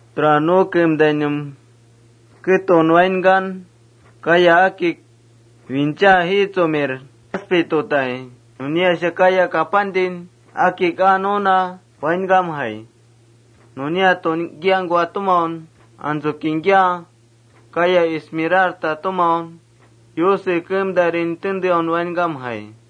Tura nu keemtainum ketun wainkan, kaya akik wincha jiitsumir jaspe tutai, nuniasha kaya kapantin akik aa nuna wainkamjai. Nunia tungkiangkua tumau, antsu kingkia kaya esmeralda tumau Yuse keemtairin tenteaun wainkamjai.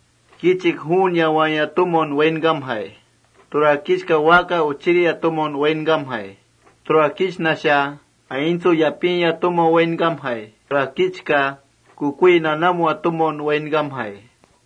Kichik juun yawaaya tumaun wainkamjai. Tura kichka waaka uchiria tumaun wainkamjai. Tura kichnasha aintsu yapiya tumaun wainkamjai. Tura kichka kukui nanamua tumaun wainkamjai.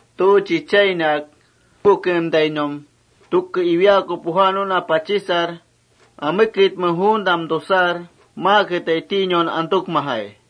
Tu chichainak apu keemtainum tuke iwiaaku puja nuna pachisar: Ameketme juuntam tusar, maaketai tinaun antukmajai.